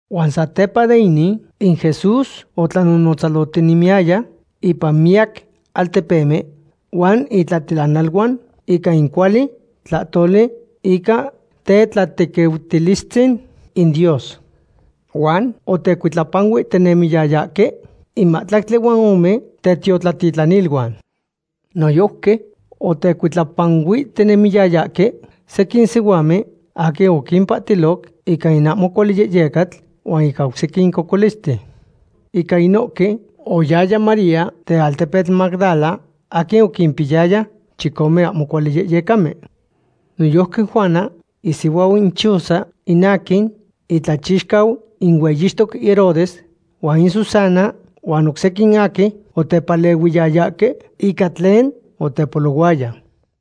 Huan satepa de inin, in Jesús otlanonotzalohtinemiyaya ipan miyac altepemen huan itlatilanaluan ica in cuali tlahtoli ica tetlatequiutilistzin in Dios. Huan otecuitlapanuihtinemiyayahque in mahtlactli huan ome tetiotlatitlaniluan. Noyojqui otecuitlapanuihtinemiyayahque sequin sihuamen aquin oquimpahtiloc ica in ahmo cuali yehyecatl huan ica oc sequin cocolisten. Ica inohque oyaya María den altepetl Magdala aquin oquimpiyaya chicome ahmo cuali yehyecamen. Noyojqui Juana isihuau in Chuza, in aquin itlachixcau in hueyixtoc Herodes, huan in Susana huan oc sequin aquin otepalehuiyayahque ica tlen otepolohuaya.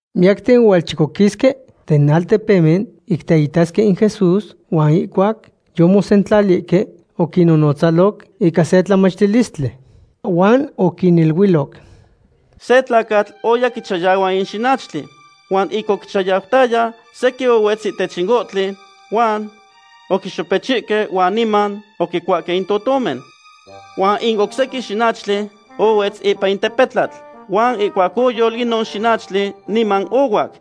Miyacten ohualchocoquisque den altepemen ic teitasque in Jesús huan ihcuac yomosentlalihque, oquinnonotzaloc ica se tlalnamictilistli. Huan oquiniluiloc: ―Se tlacatl oya quichayahua in xinachtli. Huan ic oquichayautaya, sequin ohuetz ihtech ohtli huan oquixopechihque huan niman oquicuahque in totomen. Huan in oc sequin xinachtli ohuetz ipan in tepetlatl huan ihcuac oyol inon xinachtli niman ohuac,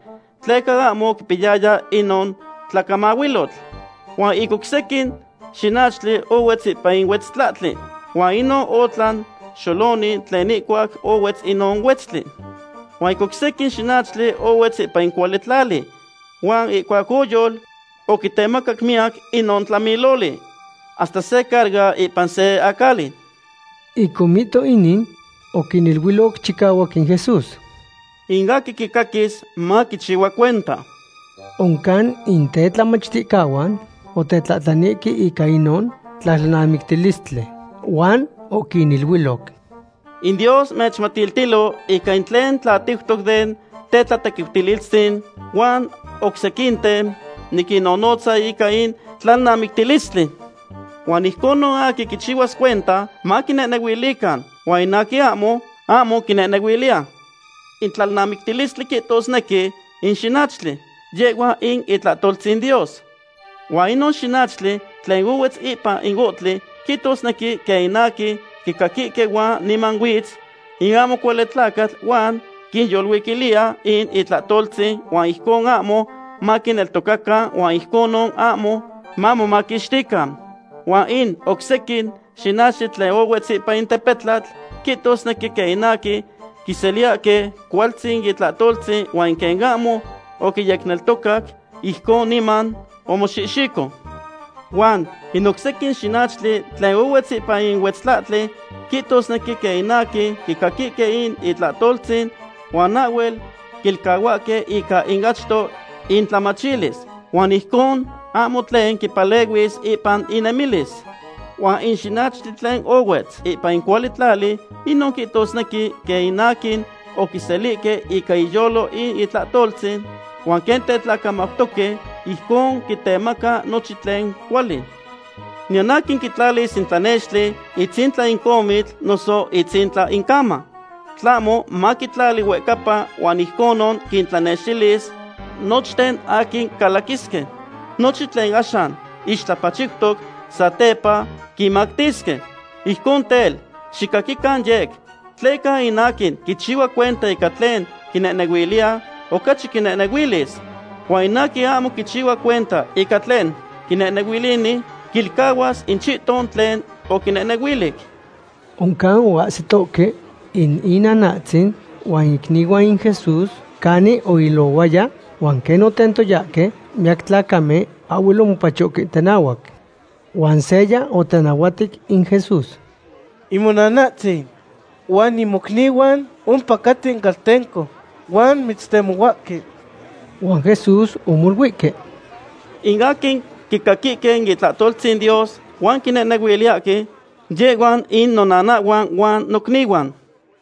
tleca ahmo oquipiyaya inon tlacamahuilotl. Huan in oc sequin xinachtli ohuetz ipan in huetztlahtli, huan inon otlan xoloni tlen inahuac ohuetz inon huetztli. Huan in oc sequin xinachtli ohuetz ipan in cuali tlali, huan ihcuac oyol, oquitemacac miyac inon tlamiloli, hasta se carga ipan se acali. Ic omihto inin, oquiniluiloc chicahuac in Jesús: ―In aquin quicaquis, maquichihua cuenta. Oncan in tetlamachticahuan otetlahtlanihque ica inon tlalnamictilistli. Huan oquiniluiloc: ―In Dios mechmatiltilo ica in tlen tlatiutoc den tetlatequiutilistzin, huan oc sequinten niquinnonotza ica in tlalnamictilistli. Huan ijcon in aquin quichihuas cuenta, maquinehnehuilican, huan in aquin ahmo, ahmo quinehnehuiliya. ’In tlalnamictilistli quihtosnequi in xinachtli, yehhua in itlahtoltzin Dios. Huan inon xinachtli tlen ohuetz ipan in ohtli quihtosnequi quen in aquin quicaquihque huan niman huitz in ahmo cuali tlacatl huan quinyolcuiliya in itlahtoltzin huan ijcon ahmo maquineltocacan huan ijconon ahmo mamomaquixtican. Huan in oc sequin xinachtli tlen ohuetz ipan tepetlatl quihtosnequi quen aquin quiseliyahque cualtzin in itlahtoltzin huan quen ahmo oquiyecneltocac, ijcon niman omoxihxico. Huan in oc sequin xinachtli tlen ohuetz ipan in huetztlahtli quihtosnequi quen in aquin quicaquihque in itlahtoltzin huan ahhuel quilcahuahque ica in achto intlamachilis. Huan ijcon ahmo tlen quimpalehuis ipan innemilis. Huan in xinachtli tlen ohuetz ipan in cuali tlali, inon quihtosnequi quen in aquin oquiselihque ica inyolo in itlahtoltzin, huan quen tetlacamautoque, ijcon quitemaca nochin tlen cuali. ’Niyan aquin quitlalis in tlanextli itzintla in comitl noso itzintla in cama. Tlahmo maquitlali huehcapa huan ijconon quintlanextilis nochten aquin calaquisque. Nochin tlen axan ixtlapachiutoc satepa quinmactisque. ’Ijcon tel, xicaquican yec, tleca in aquin quichihua cuenta ica tlen quinehnehuiliya, ocachi quinehnehuilis. Huan in aquin ahmo quichihua cuenta ica tlen quinehnehuilini, quilcahuas in chihton tlen oquinehnehuilic. Oncan oahsitohque in inanahtzin huan icnihuan in Jesús canin oilohuaya huan quen otentoyahque miyac tlacamen, ahhuel omopachohque tenahuac. Huan seya otenahuatic in Jesús: ―In monanahtzin huan in mocnihuan ompacaten caltenco huan mitztemohuahque. Huan Jesús omoluihque: ―In aquin quicaquihque in itlahtoltzin Dios huan quinehnehuiliyahque, yehhuan in nonanahhuan huan nocnihuan.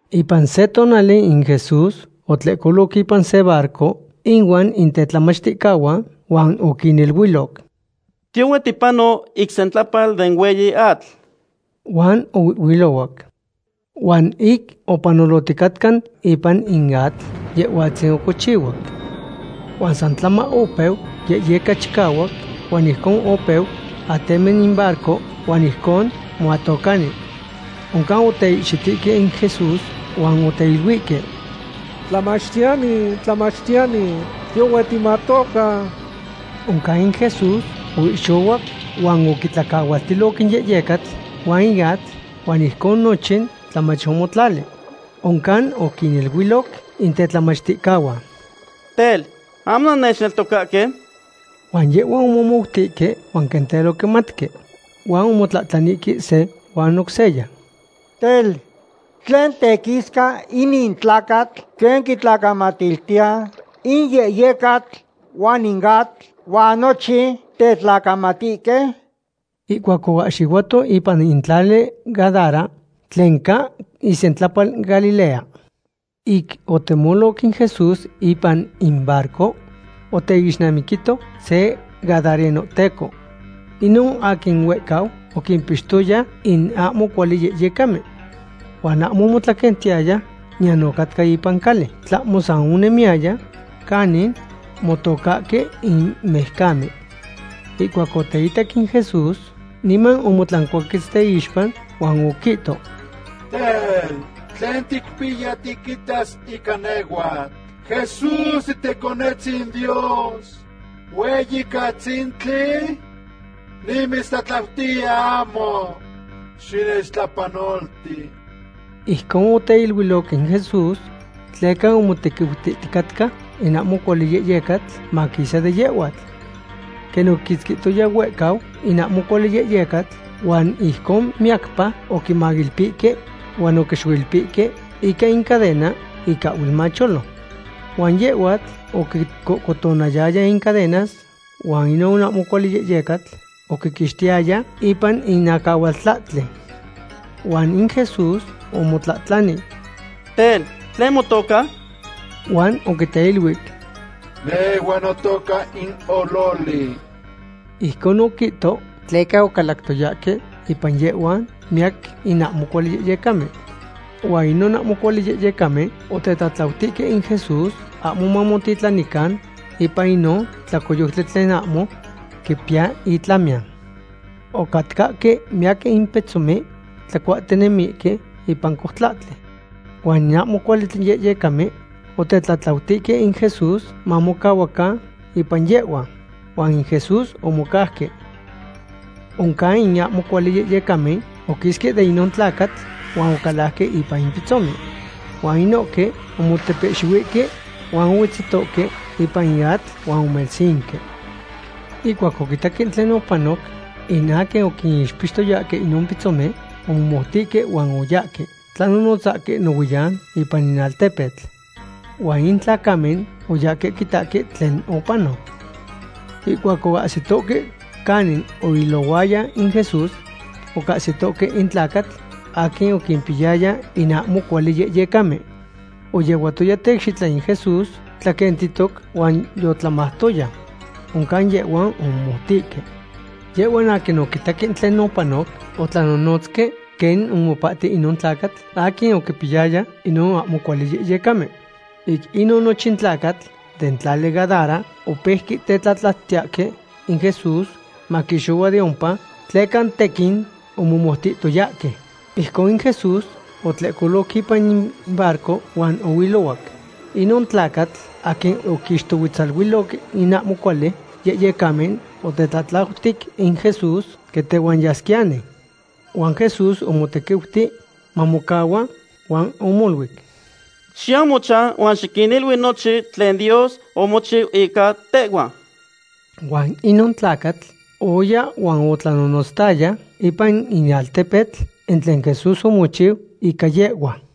Ipan se tonali in Jesús otlehcolo ipan se barco inuan in tetlamachticahuan huan oquiniluiloc: ―Tiyohue tipano ic sentlapal den hueyi atl. Huan ohuihhuilohuac. Huan ic opanolohticatca ipan in atl, Yehhuatzin ocochihuac. Huan san tlama opeu yehyeca chicahuac huan ijcon opeu atemi in barco huan ijcon moatocani. Oncan oteihxitihque in Jesús huan oteiluihque: ―¡Tlamachtiyani! ¡Tlamachtiyani! ¡Tiyohue timatoca! Oncan in Jesús oihxohuac huan oquitlacahualtiloc in yehyecatl huan in atl, huan ijcon nochin tlamach omotlali. Oncan oquiniluiloc in tetlamachticahuan: ―Tel, ¿ahmo nannechneltocahque? Huan yehhuan omomoutihque huan quen tel oquimatque. Huan omotlahtlanihque se huan oc seya: ―Tel, ¿tlen tequisca inin tlacatl, quen quitlacamatiltiya in yehyecatl huan in atl, huan nochin tetlacamatihque? Ihcuac oahxihuato ipan in tlali Gadara, tlen ca isentlapal Galilea. Ic otemoloc in Jesús ipan in barco, oteixnamiquito se gadarenohteco. Inon aquin huehcau oquimpixtoya in ahmo cuali yehyecamen. Huan ahmo omotlaquentiyaya niyan ocatca ipan cali, tlahmo san onemiyaya canin motocahque in mijcamen. Ihcuac oteitac in Jesús, niman omotlancuaquetz teixpa huan oquihto: ―Tel, ¿tlen ticpiya tiquitas ica nehhuatl, Jesús titeconetzin in Dios hueyicatzintli? Nimitztlatlautiya ahmo xinechtlapanolti. Ijcon oquiteluic in Jesús tleca omotequiutihticatca in ahmo cuali yehyecatl maquisa de yehhuatl. Quen oquiquitzquihtoya huehcau in ahmo cuali yehyecatl huan ijcon miyacpa oquimailpihque huan oquixoilpihque ica in cadena ic ahhuel macholo. Huan yehhuatl oquicohcotonayaya in cadenas huan inon ahmo cuali yehyecatl oquiquixtiyaya ipan in acahualtlahtli. Huan in Jesús omotlahtlani: ―Tel, ¿tlen motoca? Huan oquiteluic: ―Nehhua notoca in Ololi. Ijcon oquihto tleca ocalactoyahque ipan yehhua miyac in ahmo cuali yehyecamen. Huan inon ahmo cuali yehyecamen otetlatlautihque in Jesús ahmo mamotitlanican ipan inon tlacoyoctli tlen ahmo quipiya itlamiyan. Ocatcahque miyac in pitzomen tlacuahtinemihque ipan coutlahtli. Huan in ahmo cuali yehyecamen otetlatlautihque in Jesús mamocahuacan ipan yehhuan, huan in Jesús omocauque. Oncan in ahmo cuali yehyecamen oquisque de inon tlacatl huan ocalajque ipan in pitzomen. Huan inohque omotepehxihuihque huan ohuetzihtohque ipan in atl huan omelsinque. Ihcuac oquitaque tlen opanoc in aquin oquinixpiyayahque inon pitzomen, omomoutihque huan oyahque tlanonotzahque nohuiyan ipan in altepetl. Huan in tlacamen oyahque quitahque tlen opanoc. Ihcuac oahsihtoque canin oilohuaya in Jesús, ocahsitoque in tlacatl aquin oquimpiyaya in ahmo cuali yehyecamen. Oyehuatoya tecxitla in Jesús tlaquentihtoc huan yotlamautoya. Oncan yehhuan omomoutihque. Yehhuan aquin oquitaque tlen opanoc otlanonotzque quen omopahti inon tlacatl aquin oquimpiyaya inon ahmo cuali yehyecamen. Ic inon nochin tlacatl den tali Gadara opeuque tetlatlautiyahque in Jesús maquixohua de ompa, tleca tequin omomoutihtoyahque. Ijcon in Jesús otlehcoloc ipan in barco huan ohuilohuac. Inon tlacatl aquin oquinixtohuetzaluiloc in ahmo cuali yehyecamen otetlatlautic in Jesús quen tehuan yasquiyani. Huan Jesús omotequiuti mamocahua huan omoluic: ―Xiyau mochan huan xiquinilui nochin tlen Dios omochiu ica tehhua. Huan inon tlacatl oya huan otlanonotztaya ipan in altepetl in tlen Jesús omochiu ica yehhua.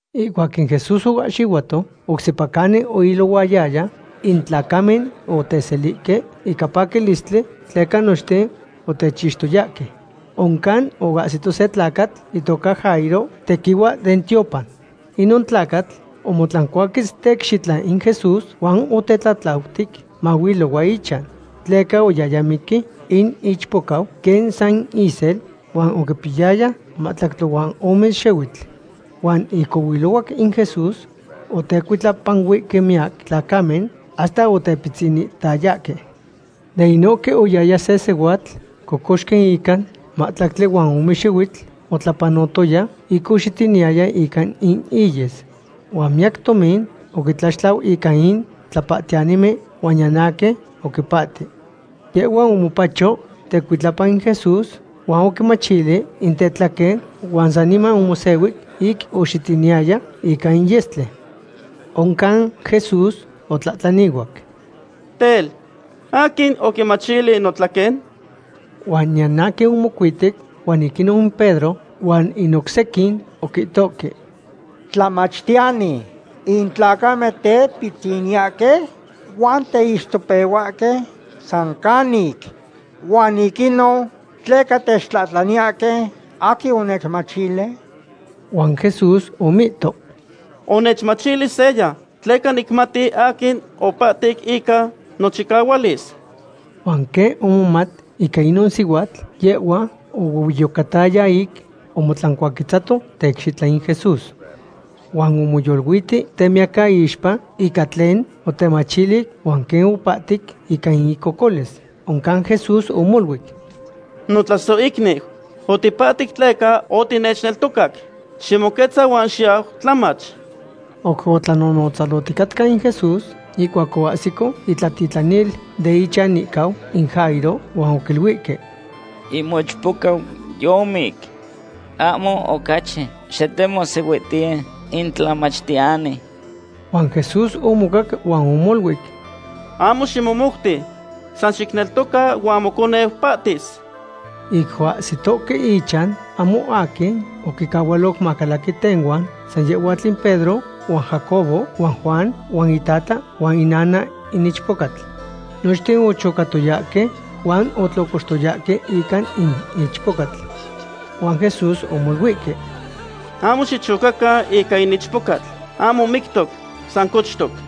Ihcuac in Jesús oahxihuato oc sepa canin oilohuaya, in tlacamen oteselihque ica paquilistli tleca nochten otechixtoyahque. Oncan oahsito se tlacatl itoca Jairo, tequihua den tiopan. Inon tlacatl omotlancuaquetz teicxitla in Jesús huan otetlatlautic mahuilohua ichan. Tleca oyaya miqui in ichpocau quen san isel huan oquipiyaya mahtlactli huan ome xihuitl. Huan ic ohuilohuac in Jesús otecuitlapanuihque miyac tlacamen hasta otepitzinihtayahque. De inohque oyaya se sihuatl cocoxqui ica mahtlactli huan ome xihuitl otlapanohtoya ic oxitiniyaya ica in iyes. Huan miyac tomin oquitlaxtlau ica in tlapahtiyanimen huan niyan aquin oquipahti. Yehhua omopacho tecuitlapa in Jesús huan oquimachili in tetlaquen huan saniman omosehui ic oxitiniyaya ica in yestli. Oncan Jesús otlahtlanihuac: ―Tel, ¿aquin oquimachili notlaquen? Huan niyan aquin omocuiti huan ic inon Pedro huan in oc sequin oquihtohque: ―Tlamachtiyani, in tlacamen tepitziniyahque huan teixtopehuahque san canic, ¿huan ic inon tleca techtlahtlaniyahque: “Aquin onechmachili”? Huan Jesús omihto: ―Onechmachili seya, tleca nicmati aquin opahtic ica nochicahualis. Huan quen omomat ica inon sihuatl, yehhua ohuehueyocataya ic omotlancuaquetzato teicxitla in Jesús. Huan omoyoluiti temiyacaixpa ica tlen otemachili huan quen opahtic ica in icocolis. Oncan Jesús omoluic: ―Notlasohicniu, otipahtic tleca otinechneltocac. Ximoquetza huan xiyau tlamach. Oc otlanonotzalohticatca in Jesús, ihcuac oahsico itlatitlanil den ichanihcau in Jairo huan oquiluihque: ―In mochpocau yomic. Ahmo ocachi xitemohsihuihtiye in tlamachtiyani. Huan Jesús omocac huan omoluic: ―Ahmo ximomouti. San xicneltoca huan moconeu pahtis. Ic oahsitohque ichan, ahmo aquin oquicahualoc macalaqui tehuan, san yehhuatl in Pedro huan Jacobo huan Juan huan itata huan inana in ichpocatl. Nochten ochocatoyahque huan otlocoxtoyahque ica in ichpocatl. Huan Jesús omoluihque: ―Ahmo xichocacan ica in ichpocatl. Ahmo mictoc, san cochtoc.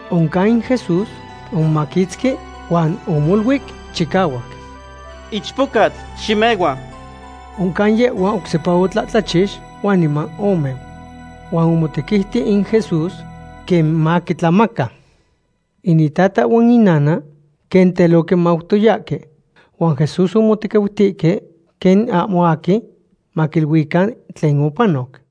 Oncan in Jesús omomaquitzqui huan omoluic chicahuac. ―Ichpocatl, ximehua. Oncan yehhua oc sepa otlahtlachix, huan niman omeu. Huan omotequiuti in Jesús quen maquitlamaca. In itata huan in inana quen tel oquimautoyahque. Huan Jesús omotequiutihque quen ahmo aquin maquiluican tlen opanoc.